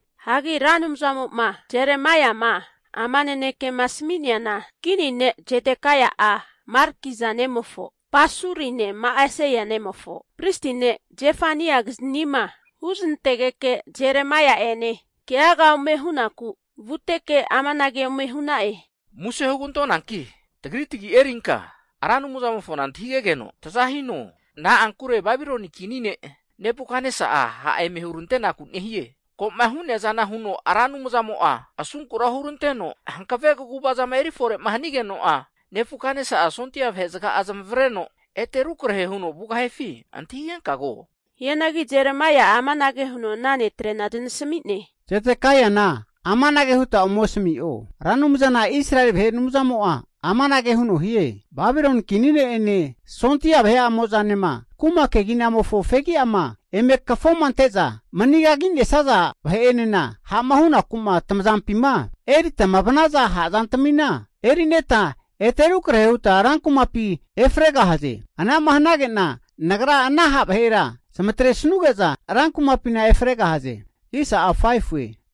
Hagi Ra Anumzamo'ma Jeremaiama ama nanekema asami'neana, kini ne' Zedekaia'a, Markija nemofo Pasurine Ma'aseia nemofo pristi ne' Zefaniakiznima huznantegeke Jeremaia'ene keaga ome hunaku vuteke amanage ome hu'na'e. Muse hugantonanki tagri tagi erinka Ra Anumzamofona antahigegeno taza hino. Na'ankure Babiloni Kini ne' Nebukatnesa'a ha' eme hurantenaku nehie. Ko'ma hu'nea zana huno Ra Anumzamo'a asunkura huranteno hankave kaguva zama eri fore'ma hanigeno'a, Nebukatnesa'a sondia vahe zaga'a zamavareno ete rukrahe huno vugahifi antahigenka ko. Hianagi Jeremaia'a amanage huno ana netrena zanasami'ne. Zedekaiana amanage huta ome asami'o. Ra Anumzana Israeli vahe Anumzamo'a amanage huno hie, Babiloni kini ne'ene sondia vahe'amozanema kuma keginamofo fegi'ama eme kafoma ante'za mani kagi'nesaza vahe'enema ha'ma hunaku'ma tamazampima eritama vanaza ha' zantamina erineta ete rukrahe huta rankumapi efregahaze. Anama hanage'na Nagra ana ha' vahera zamatresanuge'za rankumapina efregahaze.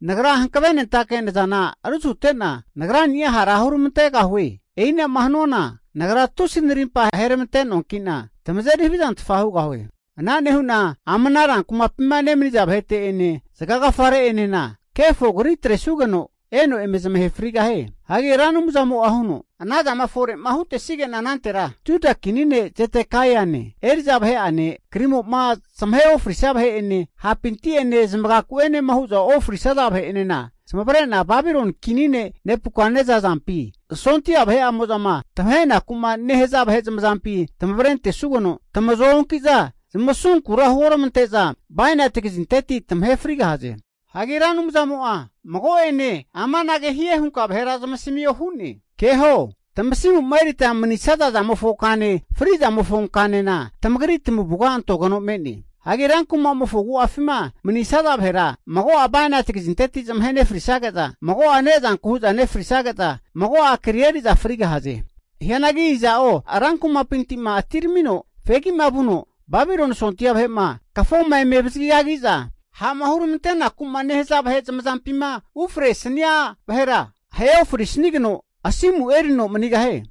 Nagra hankavenentake nazana rusute'na Nagrani'a hara huramantegahue. E'inama hanuana Nagra tusi narimpa aheramante noanki'na tamazeri havizantfa hugahue. Ana nehu'na ama rankumapima nemaniza vahete'ene, zagagafa re'enena kefo kri atresugeno eno eme zamahe frigahie. Hagi Ra Anumzamo'a huno, anazama fore'ma hutesige'na anantera, Juda kini ne' Zedekaiane, eri'za vahe'ane krimo'ma zamahe ofrisia vahe'ene, hapinti'ene zamagaku'enema hu'za ofrisaza vahe'enena, zamavare'na Babiloni kini ne' Nebukatnesa azampine sondia vahe'amo'zama tamahenaku'ma nehaza vahe zamazampi tamavre antesugeno, tamazoa onkiza zmasunkura huoramante'za bainati kazinteti tamahe frigahaze. Hagi Ra Anumzamo'a mago'ene amanage hie hunka vahera zamasamio hu'ne. Keho! Tamasimu'ma erita manisaza zamofo kane, fri'zamofo kanena tamagri tamavuga antogeno me'ne. Hagi rankumamofo agu'afima manisaza vahera mago'a bainati kazinteti zamahe nefrisage'za, mago'a ne'zanku hu'za nefrisage'za, mago'a kri eri'za frigahaze. Hianagi iza'o rankumapinti'ma atiramino fegi'ma vuno, Babiloni sondia vahe'ma kafoma eme avazagi kagi'za ha'ma huramantenaku'ma nehaza vahe zamazampima ufresania vahera ahe ofrisageno asimu erino manigahie.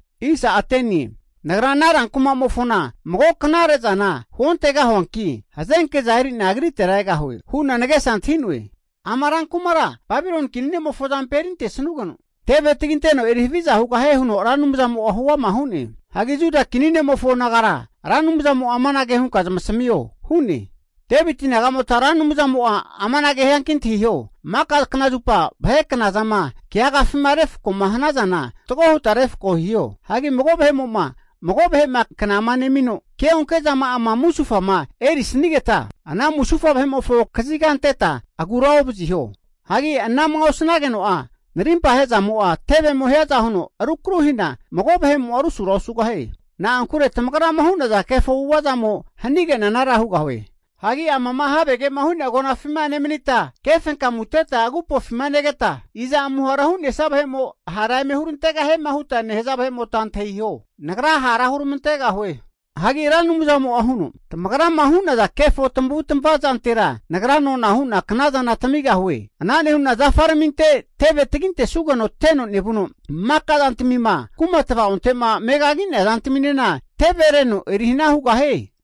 Nagra ama rankumamofona mago knare zana huontegahuanki, hazenke'za eri'na agritera egahue hu'na nagesa antahi'noe. Ama rankumara Babiloni kini ne'mofo azampi erintesanugeno, teve taginteno eri haviza hugahie huno Ra Anumzamo'a huama hu'ne. Hagi Juda kini ne'mofo nagara, Ra Anumzamo'a amanage hie hunka zamasamio hu'ne. Deviti naga'mota Ra Anumzamo'a amanage hianki antahiho, maka nanterana vahe knazama keagafima refko'ma hanazana fatgo huta refko hiho. Hagi mago vahe'mo'ma mago vahe'ma kna nemino, ke'onke zama'ama musufama eri'nesanigeta, ana musufa vahe'mofo kaziga anteta agura ovaziho. Hagi ana'ma osanageno'a, narimpa ahe'zamo'a tevemo hiaza huno rukru hina mago vahe'mo'a rusura osugahie. Na'ankure tamagrama hu'naza kefo avu'ava zamo hanige'na anara hugahue. Hagi amama havege'ma hu'nea agonafima nemanita, kefenkamuteta agupofima negeta, iza amuhara hu'nesia vahemo hara eme hurantegahiema huta nehaza vahe'mota antahiho. Nagra hara huramantegahue. Hagi Ra Anumzamo'a huno, Tamagrama hu'naza kefo tamavu tamava zantera, Nagra nona hu'na knazana tamigahue. Ana nehu'na zafaraminte teve tagintesugeno teno nevuno, maka zantamima kuma tva'onte'ma megagi'nea zantaminena tevereno erihana hugahie.